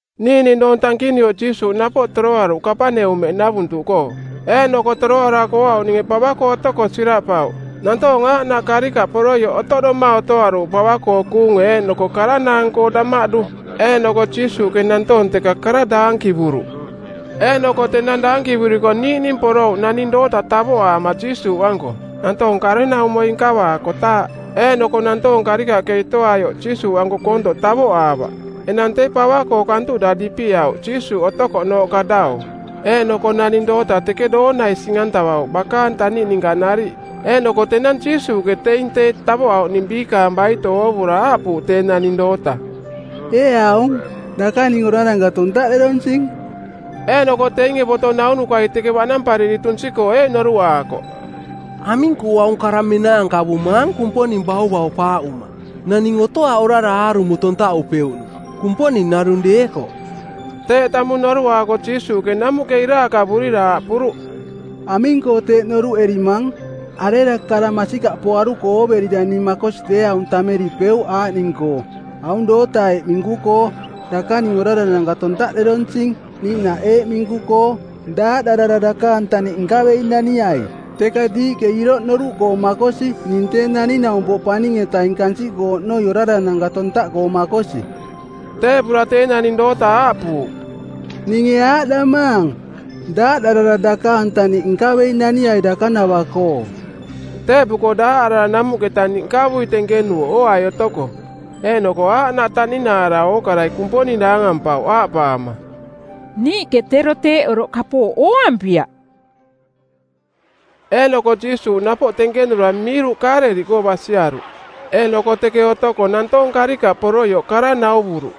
Niiꞌning doong tankinuioꞌ Jiisuuꞌ napoꞌ toroaruꞌ Kapaneumeꞌnavuntuꞌkoo. Eeꞌnoko toroarako ooauꞌninge pava-koo otoko siraꞌpauꞌ. Nantoong aaꞌnaꞌ karikaꞌ poroioꞌ otoꞌdoma otoaruuꞌ pava-koo kuunge eeꞌnoko karanaang-koo damaꞌdu. Eeꞌnoko Jiisuuꞌke nantoong teka kara daankivuruꞌ. Eeꞌnoko tenang daankivuriko niiꞌning porouꞌ naning doota tavoꞌaama Jiisuuꞌanko, nantoong karenaumoi nkavaakotaaꞌ. Eeꞌnoko nantoong karikaꞌke itoꞌaioꞌ Jiisuuꞌanko koontoꞌ tavoꞌaavaꞌ. Enang tee pava-koo kantuꞌda dipiꞌauꞌ Jiisuuꞌ otouꞌnooꞌka dau. Eeꞌnoko naning doota teke doonai sing-antavauꞌ bakaang taniꞌ ninka nariꞌ. Eeꞌnoko tenang Jiisuuꞌke teing tee tavoꞌauꞌning biikaang baito oovura aaꞌpuuꞌ tee naning doota, “Ee aung, dakaning orarananka tontaꞌderonsing.” Eeꞌnoko teinge boto naunukai teke baꞌnampariri tunsi-koo eeꞌ noruꞌaakoꞌ, “Aming-koo aung kara menaankavumaang Kumponing bauvaupaaꞌuma? Naning otoaꞌ orara aarumo tontaꞌupeuꞌnung, Kumponing narung deekoꞌ.” Teeꞌ tamung noruꞌaako Jiisuuꞌke namuꞌke iraakavurira aaꞌpuruꞌ, “Aming-koo teeꞌ noruꞌerimang? Arera kara masikaꞌpoaruko ooverira ning makosi deeaung tammeripeuꞌ aaꞌning-koo, aung doota eeꞌ minku-koo, ‘Dakaning orarananka tontaꞌderonsing,’ niiꞌnaꞌ eeꞌ minku-koo, ‘Daaꞌdarara dakaang taniꞌ nkavei naniai.’? Teka diiꞌke iroꞌ noruꞌkoo makosi ning Tee Naning-naumpoꞌ Paning-etaing kansiꞌkoo oꞌnoi orarananka tontaꞌkoo makosi...” Teeꞌpura tee naning doota aaꞌpuuꞌ, “Ninge aaꞌdamaang, daaꞌdarara dakaang taniꞌ nkavei naniai dakanava-koo.” Teeꞌpuko daaꞌarara namuꞌke taniꞌ nkavui tenkenuuꞌ ooai otoko. Eeꞌnoko aaꞌnaꞌ taꞌninaara ookarai Kumponing daangampauꞌ aaꞌpaama, “Niiꞌke tero teeꞌ oroꞌ kapooꞌ ooampiaꞌ.” Eeꞌnoko Jiisuuꞌ napoꞌ tenkenura miiruꞌ Kaaleliꞌkoo basiaruꞌ. Eeꞌnoko teke otoko nantoong karikaꞌ poroioꞌ kara nauvuruꞌ.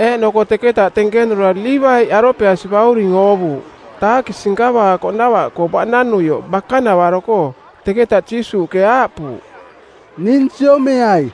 Eeꞌnoko teketa tenkenura Liivaiꞌ, Alopeasi bauring, oovuuꞌ taakisi nkavaakoꞌnava-koo baꞌnanuioꞌ bakanavaro-koo. Teketa Jiisuuꞌke aaꞌpuuꞌ, “Ning siomeai.”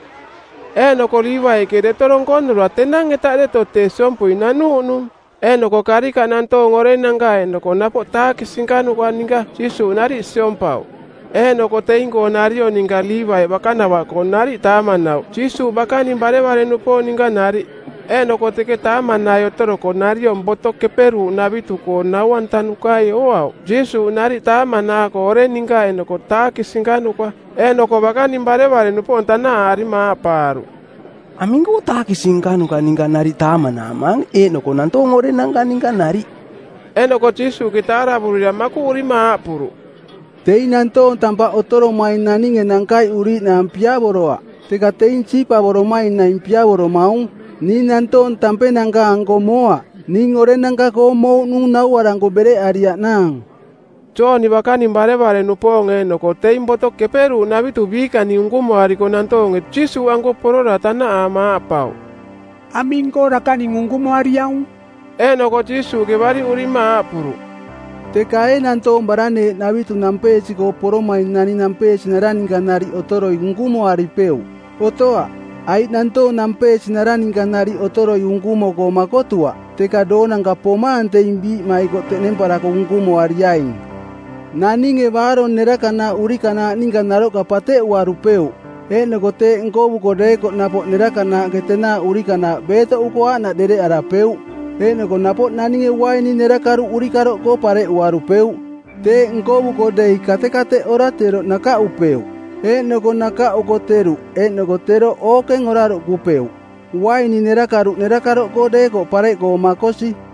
Eeꞌnoko Liivaiꞌke deto donkonura tenang-eta deto tee siompui nanuuꞌnung. Eeꞌnoko karikaꞌ nantoong orenanka eeꞌnoko napoꞌ taakisi nkanuka ninka Jiisuuꞌ nariꞌ siompauꞌ. Eeꞌnoko teing-koo nariong ninka Liivaiꞌ bakanavaꞌkoo nariꞌ taamanauꞌ Jiisuuꞌ bakaning barevare-nupoong ninka nariꞌ. Eeꞌnoko teke taamanai otoroko nariong Boto Keperuuꞌnavitu-koo nau-antanukai ooauꞌ Jiisuuꞌ nariꞌ taamanaako oreng ninka eeꞌnoko taakisi nkanuka. Eeꞌnoko bakaning barevare-nupoong tanaꞌaarima aaꞌpaaruꞌ, “Aming-koo taakisi nkanuka ninka nariꞌ taamanaamaang eeꞌnoko nantoong orenanka ninka nariꞌ?” Eeꞌnoko Jiisuuꞌke taaravurira makuꞌurima aaꞌpuruꞌ, “Teing nantoong tampaꞌ otoromaing naninge nankaiꞌuriiꞌnaang piavoroaꞌ, teka teing siipavoromaing naing piavoromaung. Ning nantoong tampenanka-anko moaꞌ. Ning orenanka-koo mouꞌnung nauaranko bereꞌariaꞌnaang.” Jooni bakaning barevare-nupoong eeꞌnoko teing Boto Keperuuꞌnavitu biikaning unkumoariko nantoonge Jiisuuꞌanko porora tanaꞌaama aaꞌpauꞌ, “Aming-koo dakaning unkumoariaung?” Eeꞌnoko Jiisuuꞌke bariꞌurima aaꞌpuruꞌ, “Teka ee nantoong baraneeꞌ navitu nampeesi-koo poromaing naning nampeesinara ninka nariꞌ otoroi unkumoaripeuꞌ? Otoaꞌ, aiꞌ nantoong nampeesinara ninka nariꞌ otoroi unkumo-koo makotuaꞌ. Teka doonanka pomaang teing biiꞌmaikoꞌ teꞌnemparako unkumoariaing. Naninge baarong nerakanaaꞌ urikanaaꞌ ninka naroꞌka pateꞌuarupeuꞌ. Eeꞌnoko teeꞌ nkovuko deekoꞌ napoꞌ nerakanaaꞌke tenaaꞌ urikanaaꞌ beetoꞌuko aaꞌnaꞌ dereꞌarapeuꞌ. Eeꞌnoko napoꞌ naninge uaini nerakaruꞌ urikaroꞌkoo pareꞌuarupeuꞌ. Teeꞌ nkovuko dei katekateꞌora teroꞌ nakaꞌupeuꞌ. Eeꞌnoko nakaꞌuko teruꞌ eeꞌnoko teroꞌ ookeng oraruꞌkupeuꞌ. Uaini nerakaruꞌ nerakaroꞌkoo deekoꞌ pareꞌkoo makosi.”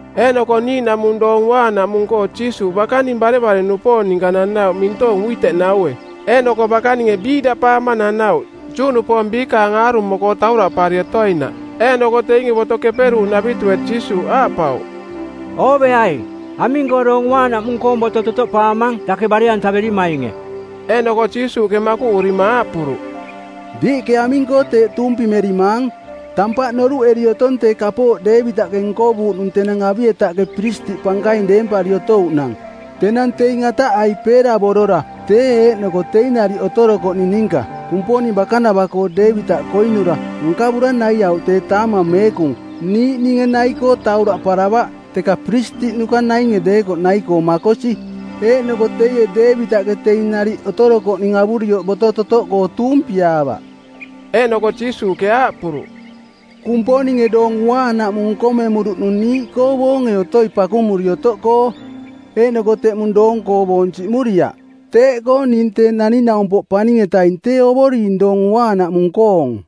Eeꞌnoko niiꞌnaꞌmung Doong Uaanaꞌmung-koo Jiisuuꞌ bakaning barevare-nupoong ninka nanauꞌ mintoong uiteꞌnaue˜. Eeꞌnoko bakaninge biiꞌdaꞌpaama nanauꞌ, Juꞌnupoong biikaang aarumo-koo tauraꞌpari otoinaꞌ. Eeꞌnoko teinge Boto Keperuuꞌnavitue˜ Jiisuuꞌ aaꞌpauꞌ, “Ooveai. Aming-koo Doong Uaanaꞌmung-koong boto totoꞌpaamang dake bare-antaverimainge?” Eeꞌnoko Jiisuuꞌke makuꞌurima aaꞌpuruꞌ, “Diiꞌke aming-koo teeꞌ tuumpimerimaang? Tampaꞌ noruꞌeri otong tee kapooꞌ Deevitaꞌke nkovuuꞌnung tenang Abietaꞌke piristiꞌ pankaing deempari otouꞌnang, tenang teing ataꞌai peeravorora, tee eeꞌnoko teing nariꞌ otorokoꞌning ninka; Kumponing bakanava-koo Deevitaꞌke koinura, nkavura naiauꞌ tee taamang meekung, niiꞌninge nai-koo tauraꞌparavaꞌ, teka piristiꞌnuka nainge deekoꞌ nai-koo makosi. Eeꞌnoko teie Deevitaꞌke teing nariꞌ otorokoꞌning avurioꞌ boto totoꞌkoo tuumpiaavaꞌ.” Eeꞌnoko Jiisuuꞌke aaꞌpuruꞌ, “Kumponinge Doong Uaanaꞌmung nkomemuruꞌnung niiꞌkoo boonge otoi pakumuri otoꞌkoo. Eeꞌnoko teꞌmung-koo boong siꞌmuriaꞌ. Teeꞌkoo ning Tee Naning-naumpoꞌ Paning-etaing tee Ovoring Doong Uaanaꞌmung-koong.”